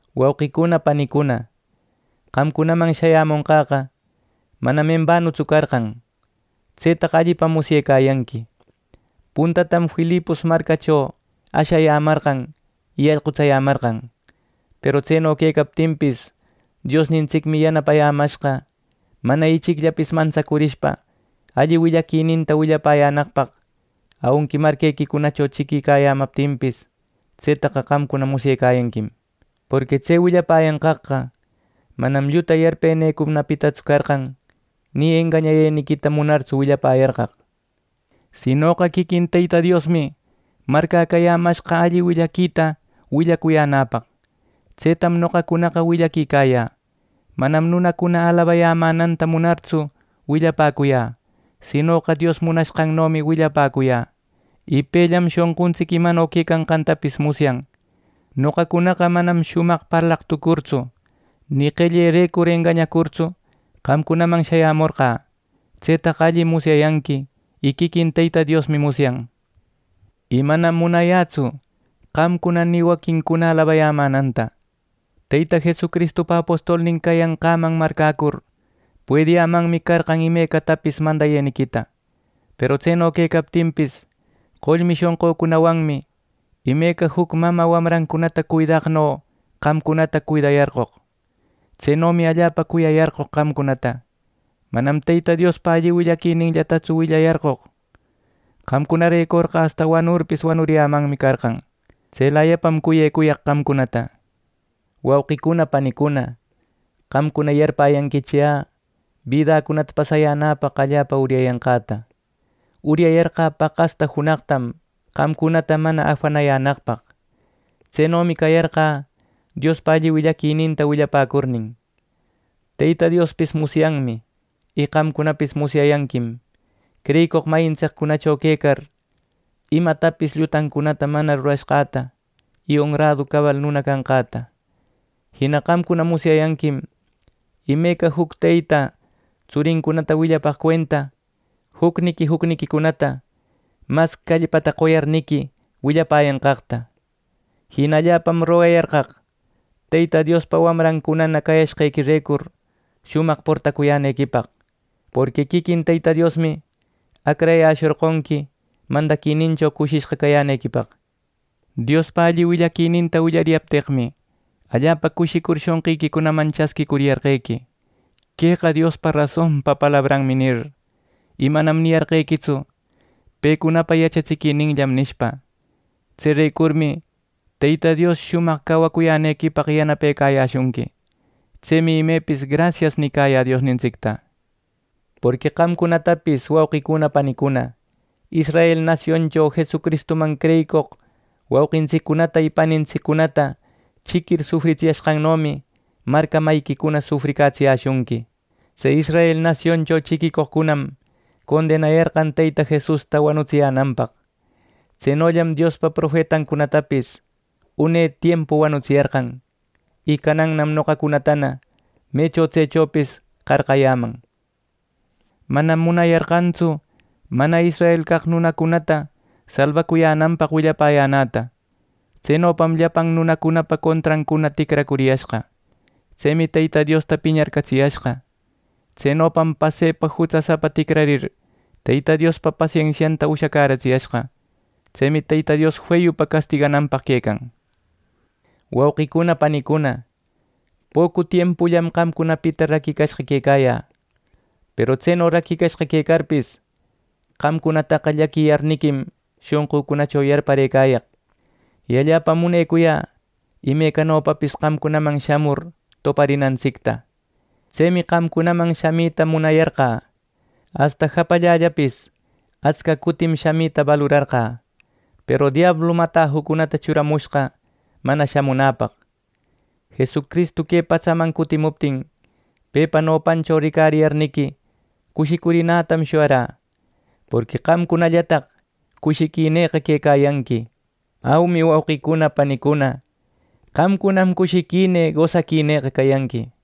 Wauqicuna panicuna, qamcunaman shayämonqäqa manam embanutsu carqan. Tsetaqa allipam musyecayanqui. Puntatam Filipos marcacho ashayämarqan y allqutsayämarqan. Peru tseno quecaptinpis Diosnintsicmi yanapayämashqa mana ichicllapis mantsacurishpa alli willaquininta willayänaqpaq aunqui marquequicunacho chiquicayämaptinpis. Tsetaqa qamcuna musyecayanquim. Porqui tse willapäyanqaqqa, manam lluta yarpenïcunapitatsu carqan, ni engañayeniquita munartsu willapäyarqaq; sinoqa quiquin Teyta Diosmi marcäcayämashqa alli willaquita willacuyänäpaq. Tsetam noqacunaqa willaquicayä. Manam nunacuna alabayämänanta munartsu willapäcuyä; sinoqa Dios munashqannomi willapäcuyä. Y pellam shonquntsic imano quecanqantapis musyan. Noqacunaqa manam shumaq parlaq tucurtsu, ni qellerecur engañacurtsu, qamcunaman shayämorqä. Tsetaqa allim musyayanqui, y quiquin Teyta Diosmi musyan. Y manam munayätsu qamcuna ni waquincuna alabayämänanta. Teyta Jesucristupa apostolnin cayanqäman marcäcur, puediyämanmi carqan imecatapis mandayeniquita. Peru tseno quecaptinpis, qollmi shonqücunawanmi, imeca juc mamä wamrancunata cuidaqno qamcunata cuidayarqoq. Tsenomi allapa cuyayarqoq qamcunata. Manam Teyta Diospa alli willaquininllatatsu willayarqoq; qamcunarecorqa asta wanurpis wanuriyämanmi carqan. Tselayapam cuyecuyaq qamcunata. Wauqicuna panicuna, qamcuna yarpäyanquichi yä bidäcunata pasayänäpaq allapa uryayanqäta. Uryayarqä paqasta junaqtam qamcunata mana afanayänaqpaq. Tsenomi cayarqä Diospa alli willaquita willapäcurnin. Teyta Diospis musyanmi, y qamcunapis musyayanquim creyicoq mayintsiccunacho quecar, imatapis llutancunata mana rurayashqäta y onradu cabal nuna cayanqäta. Jina qamcuna musyayanquim, imeca juc teyta tsurincunata willapaq cuenta, jucniqui jucniquicunata mas callpata qoyarniqui willapäyanqaqta. Jina allapam rogayarqaq Teyta Diospa wamrancuna cayashqequirecur shumaq portacuyänequipaq, porqui quiquin Teyta Diosmi acrayäshorqonqui mandaquinincho cushishqa cayänequipaq. Diospa alli willaquininta willariyapteqmi, allapa cushicur shonqiquicunaman chasquïcuyarqequi, “Queqa Diospa rasonpa palabranmi” nir, y manam niyarqequitsu “Pecunapa yachatsiquininllam” nishpa. Tserecurmi Teyta Dios shumaq cawacuyänequipaq yanapecayäshunqui. Tsemi imepis “Grasias” nicayä Diosnintsicta. Porqui qamcunatapis, wauqicuna panicuna, Israel nasioncho Jesucristuman creyicoq wauqintsiccunata y panintsiccunata chiquir sufritsiyashqannomi marca mayiquicuna sufricatsiyäshunqui. Tse Israel nasioncho chiquicoqcunam condenayarqan Teyta Jesusta wanutsiyänanpaq. Tsenollam Diospa profetancunatapis une tiempu wanutsiyarqan. Y canannam noqacunatana mecho tsechopis qarqayäman. Manam munayarqantsu mana israel caq nunacunata salbacuyänanpaq willapäyänäta. Tsenopam llapan nunacunapa contrancuna ticracuriyashqa. Tsemi Teyta Diosta piñarcatsiyashqa. Tsenopam pasepa jutsasapa ticrarir, Teyta Diospa pasensianta ushacäratsiyashqa. Tsemi Teyta Dios feyupa castigananpaq quecan. Wauqicuna panicuna, pocu tiempullam qamcunapita raquicashqa quecayä. Peru tseno raquicashqa quecarpis, qamcunataqa llaquiyarniquim shonqücunacho yarparëcayaq y allapam munecuyä imecanopapis qamcunaman shamur toparinantsicta. Tsemi qamcunaman shamita munayarqä. Asta japallällapis atsca cutim shamita balurarqä, peru diablum atajucunata churamushqa mana shamunäpaq. Jesucristu que patsaman cutimuptin pepa nopancho ricariyarniqui cushicurinätam shuyarä, ¡porqui qamcunallataq cushiquinïqa quecayanqui! ¡Aumi wauqicuna panicuna, qamcunam cushiquinï gosaquinïqa cayanqui!